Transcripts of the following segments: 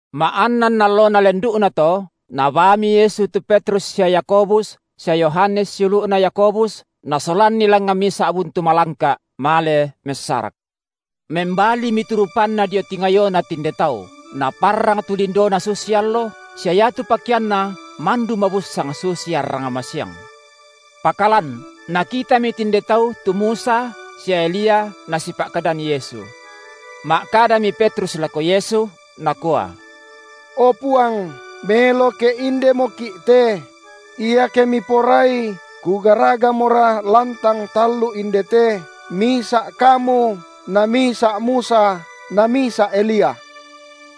Ma’annan allona lendu’nato, Nabaami Yesu tu Petrus sia Yakobus sia Yohanes siulu’na Yakobus, Nasolanni langngan misa’ buntu malangka’, male messarak. Membalimi tu rupanNa dio tingayona tinde tau, naparrang tu lindoNa susi allo, sia iatu pakeanNa mandu mabusssang susi arrang masiang. Pakalan nakitami tinde tau tu Musa sia Elia nasipa’kadan Yesu. Ma’kadami Petrus lako Yesu, nakua: O Puang, melo ke indemoki’ te; iake Miporai, kugaragamora lantang tallu indete, misa’ Kamu, na misa’ Musa na misa’ Elia.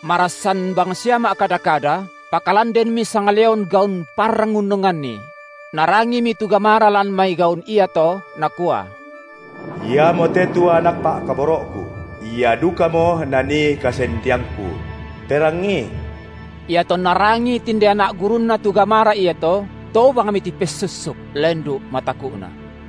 Marassan bangsia ma’kada-kada, pakalan denmi sangleon gaun parrang unnonganni; narangimi tu gamara lan mai gaun iato nakua: Iamote tu Anak Pa’kaboro’Ku, Ia dukamo nanii kasendeangKu; perangii. Iatonna rangii tinde anak gurunNa tu gamara iato, tobangmi tipessussuk, lendu’ mataku’na.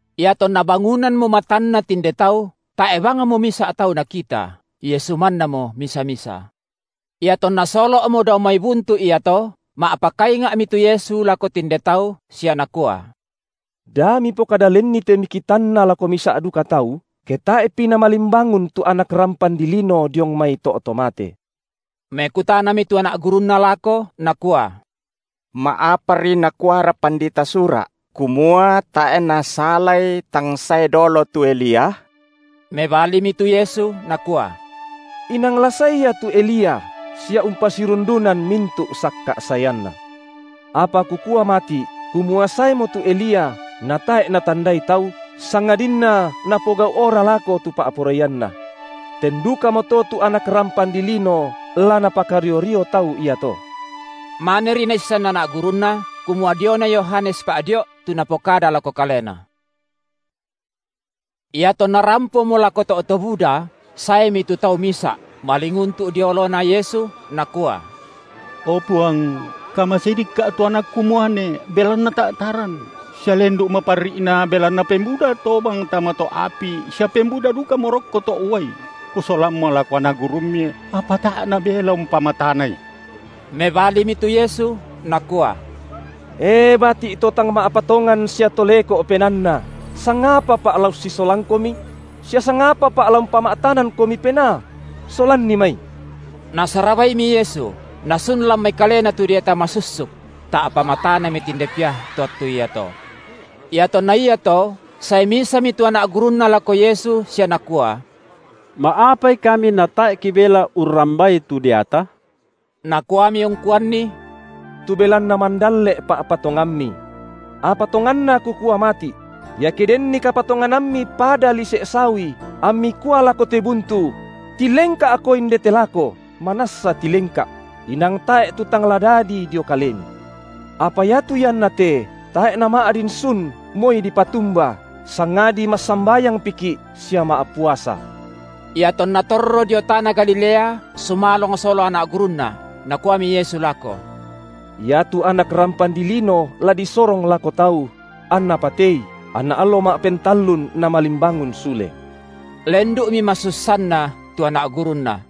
Iatonna bangunammo matanna tinde tau, tae’ bangmo misa’ tau nakita, Yesu mannamo misa-misa. Iatonna solo’mo dao mai buntu iato, ma’pakainga’mi tu Yesu lako tinde tau sia Nakua: Da mipokada lenni te mikitanna lako misa’ duka tau, ke tae’pi Namalimbangun tu Anak rampan dilino diong mai to’ to mate. Mekutanami tu anak gurunNa lako nakua: Ma’apari nakuara pandita Sura’, kumua tae’ nasalai tang sae dolo tu Elia? Mebalimi tu Yesu Nakua: Inang la sae ia tu Elia, sia umpasirundunan mintu’ sakka’ saeanna. Apa Kukua mati’, kumua saemo tu Elia, na tae’ natandai tau, sangadinna napogau’ora lako tu pa’poraianna. Ten dukamoto tu Anak rampan dilino la napakario-rio tau iato. Maneri naissan anak gurunNa, kumua diona Yohanes Pa’dio’ tu Napokada lako kalena. Iatonna rampomo lako to’ to buda, saemi tu tau misa’, malinguntu’ dio oloNa Yesu nakua: O Puang, kamasei dikka’ tu anakku muane, belanna ta’taran, sia lendu’ maparri’na; belanna pembuda tobang tama to’ api sia pembuda dukamo rokko to’ uai, kusolammo lako anak gurumMi, apa tae’ nabelai umpamatanai. Mebalimi tu Yesu Nakua: E bati’ to tang ma’patongan sia to leko’ penaanna, sangapaPa’ la ussisolangkomi? Sia sangapaPa’ la umpama’tanangkomi penaa? Solanni mai. Nasarabaimi Yesu, nasun lan mai kalena tu deata masussuk; ta’pa matanami tinde pia to attu iato. Iatonna iato sae misami tu anak gurunNa lako Yesu sia nakua: Ma’apai kami natae’ kibelai urrambai tu deata? Nakuami ungkuanni: Tu belanna mandalle’ pa’patonganmi. Apa tonganna Kukua mati’: iake denni kapatonganammi pada lise’ sawi, ammi kua lako te buntu: Tilengka’ko indete lako, manassa tilengka’; inang tae’ tu tang la dadi dio kalemi. (Apa iatu ianna te tae’ nama’din sun moi dipatumba, sangadi massambayangpiki’ sia ma’puasa.) Iatonna torro dio tana Galilea sumalong sola anak gurunNa. Nakuami Yesu lako: Iatu Anak rampan dilino la disorong lako tau; anna patei, anna allo ma’pentallun Namalimbangun sule. Lendu’mi masussanna tu anak gurunNa.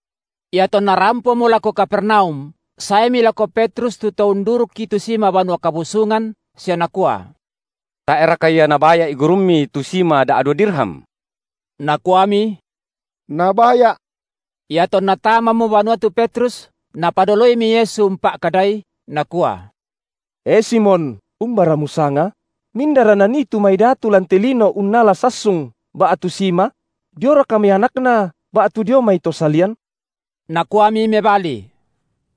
Iatonna rampomo lako Kapernaum saemi lako Petrus tu to undurukki tu sima Banua Kabusungan sia nakua: Tae’ raka ia Nabaya’i Gurummi tu sima da’dua dirham? Nakuami: Nabaya’. Iatonna tamamo banua tu Petrus, Napadoloimi Yesu umpa’kadai, Nakua: E Simon, umbara musanga? Mindara nanii tu mai datu lan te lino unnala sassung ba’tu sima? Dioraka mai anakna ba’tu dio mai to salian? Nakuami mebali: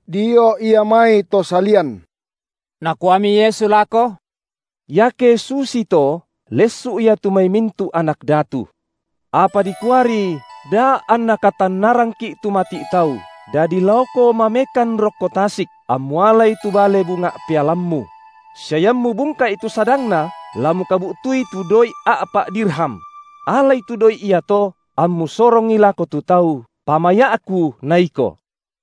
Dio ia mai to salian. Nakuami Yesu lako: Iake susii to, lessu’ ia tu mai mintu’ anak datu. Apa dikuari daa’ anna katannarangki’ tu mati’ tau, dadi laoko mamekan rokko tasik, ammu alai tu bale bunga’ pealammu; sia iammu bungka’i tu sadangna, la mukabu’tui tu doi’ a’pa’ dirham; alai tu doi’ iato, ammu sorongi lako tu tau, pamaya’Ku na iko.